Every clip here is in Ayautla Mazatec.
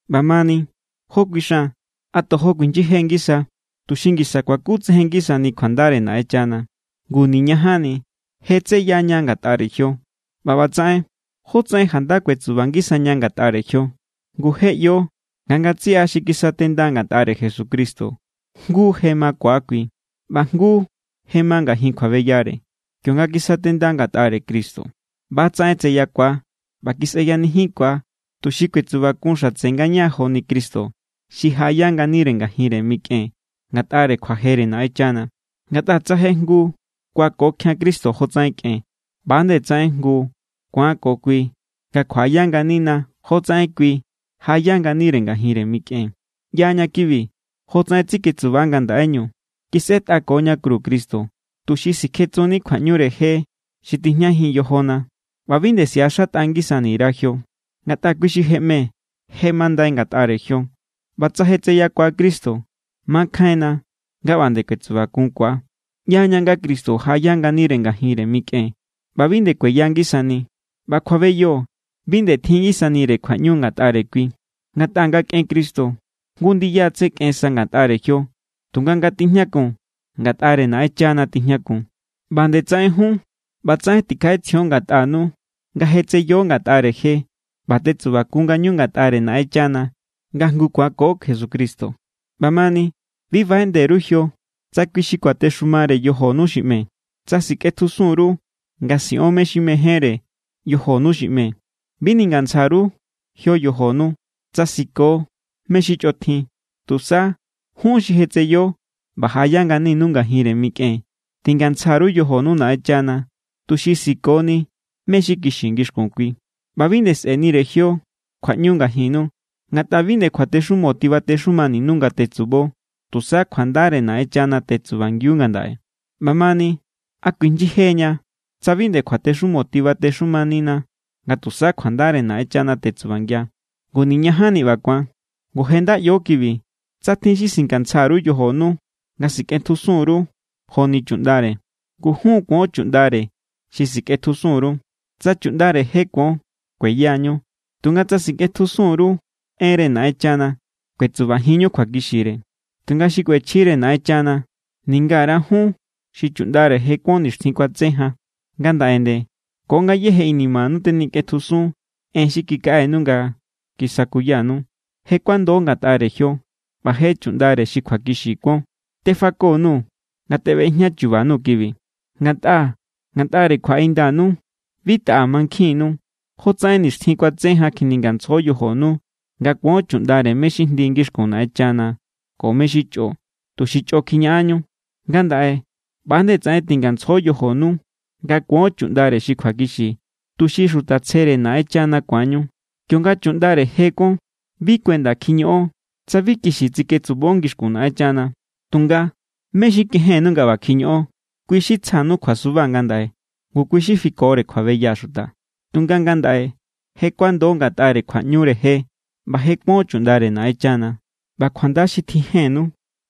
ꞌBamani, ¿jó kuixan? ¿A tojo kuijnyije ngisa, tuxi ngisa kuakutsejen ngisani kjuandare Naꞌenchana? ¡Ngu niñajanni! Je tseya ña ngatꞌare jio. ꞌBa ꞌbatsaꞌen, ¿jótsaꞌen janda kuetsuba ngisaña ngatꞌare jio? Ngu je ꞌyo nga ngatsiꞌa xi kisatenda ngatꞌare Jesucristo jngu je makua kui, ꞌba jngu je ma ngajin kjuabeyare. Kionga kisatenda ngatꞌare Cristo, ꞌba=tsaꞌen tseyakua ꞌba kisꞌeyanijinkua, tuxi kuetsubakun xatse ngaña joni Cristo xi jaꞌaya nganire ngajinre mikꞌen ngatꞌare kjuajere Naꞌenchana. Ngatꞌa tsa je jngu kuakokjian Cristo jotsaꞌen kꞌen, ꞌba=nde tsaꞌen jngu ku̱an ko kui nga kjuaꞌaya nganina jotsaꞌen kui jaꞌaya nganire ngajinre mikꞌen. ꞌYaña kibi. Jotsaꞌen tseketsuba ngandaꞌeñu kisꞌetꞌakoña kru Cristo, tuxi sikjetsunni kjuaꞌñure je xi tijñajin yojona ꞌba bi nde siꞌaxatꞌa ngisani_ra jio. Ngatꞌa kui xi je ꞌme, je mandai ngatꞌare jio. ꞌBa tsa je tseyakua Cristo, makjainna nga ꞌba nde kuetsubakunkua. ꞌYaña nga Cristo jaꞌaya nganire ngajinre mikꞌen ꞌba bi nde kueya ngisani. ꞌBa kjuabeyo bi nde tjin ngisanire kjuaꞌñu ngatꞌare kui. Ngatꞌa nga kꞌen Cristo, jngu ndiya= tse kꞌensa ngatꞌare jio. Tunga nga tijñakun, ngatꞌare Naꞌenchana tijñakun. ꞌBa nde tsaꞌen jun, ꞌbatsaꞌen tikjaꞌetsjion ngatꞌanu nga je tseyo ngatꞌare je ꞌba tetsubakunñu ngatꞌare Naꞌenchana nga jngu kuanko Jesucristo. ꞌBamani bi baꞌeꞌnde_ru jio tsa kui xi kuatexumare yojonu xi ꞌme, tsa sikꞌetjusun_ru nga siꞌon xi mejénre yojonu xi ꞌme. Bi ningantsja_ru jio yojonu tsa siko mé= xi chꞌotjin. Tusa, jun xi je tseyo ꞌba jaꞌaya nganinu ngajinre mikꞌen, tingantsja_ru yojonu Naꞌenchana tuxi sikoni mé= xi kixi ngixkun kui. ꞌBa bi nde sꞌe̱nire jio kjuaꞌñu ngajinnu, ngatꞌa bi nde kjuatexumo tibatexumaninu nga tetsubo. Tusa kjuandare Naꞌenchana tetsubangiu ngandaꞌe. ꞌBamani, ¿a kuijnyijeña tsa bi nde kjuatexumo tibatexumanina nga tusa kjuandare Naꞌenchana tetsubangia? ¡Ngu niñajanni ꞌba ku̱an! Ngu je nda ꞌyo kibi. Tsa tjin xi singantsja_ru yojonu nga sikꞌetjusun_ru joni chuꞌndare, ngu jun= kuon chuꞌndare xi sikꞌetjusun_ru. Tsa chuꞌndare je kuon, kueyañu. Tunga tsa sikꞌetjusun_ru enre Naꞌenchana, kuetsubajinñu kjuakixire. Tunga xikꞌuechjire Naꞌenchana ningara jun xi chuꞌndare je kuon nixtjin kuatse jan, ngandaꞌe nde ko ngayéje inimanu tenikꞌetjusun en xi kikaꞌenu nga kisakuyanu. Je kuando ngatꞌare jio ꞌba je chuꞌndare xi kjuakixi kuon. Tefako_nuu̱ nga teꞌbejña chuba _nuu̱ kibi, ngatꞌa ngatꞌare kjuaꞌindanu bi taꞌa mankjinnu. Jotsaꞌen nixtjin kuatse jan kjiningantsjo yojonu nga kuon chuꞌndare mé= xi jndi ngixkun Naꞌenchana ko mé= xi chꞌo, tuxi chꞌo kjiñaꞌanñu. Ngandaꞌe ꞌba=nde tsaꞌen tingantsjo yojonu nga kuon chuꞌndare xi kjuakixi, tuxi xuta tsjere Naꞌenchana ku̱anñu. Kionga chuꞌndare je kuon, bi kuenda kjiñoꞌon tsa bi kixi tsiketsubo ngixkun Naꞌenchana. Tunga, ¿mé= xi kejennu nga ꞌba kjiñoꞌon? Kui= xi tsja_nuu̱ kjuasuba ngandaꞌe ngu kui= xi fikore kjuabeya xuta. Tunga ngandaꞌe je kuando ngatꞌare kjuaꞌñure je ꞌba je kuon chuꞌndare Naꞌenchana. ꞌBa kjuanda xi tjijennu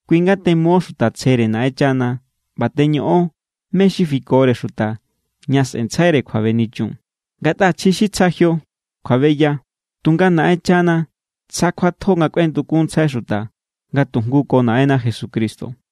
kui= nga temo xuta tsjere Naꞌenchana ꞌba teñoꞌon mé= xi fikore xuta ña sꞌe̱ntsjaire kjuabenichun. Ngatꞌa chji xi tsja jio, kjuabeya. Tunga Naꞌenchana tsja kjuatjo nga kꞌuendukunntsjai xuta nga tujngu ko Naꞌenna Jesucristo.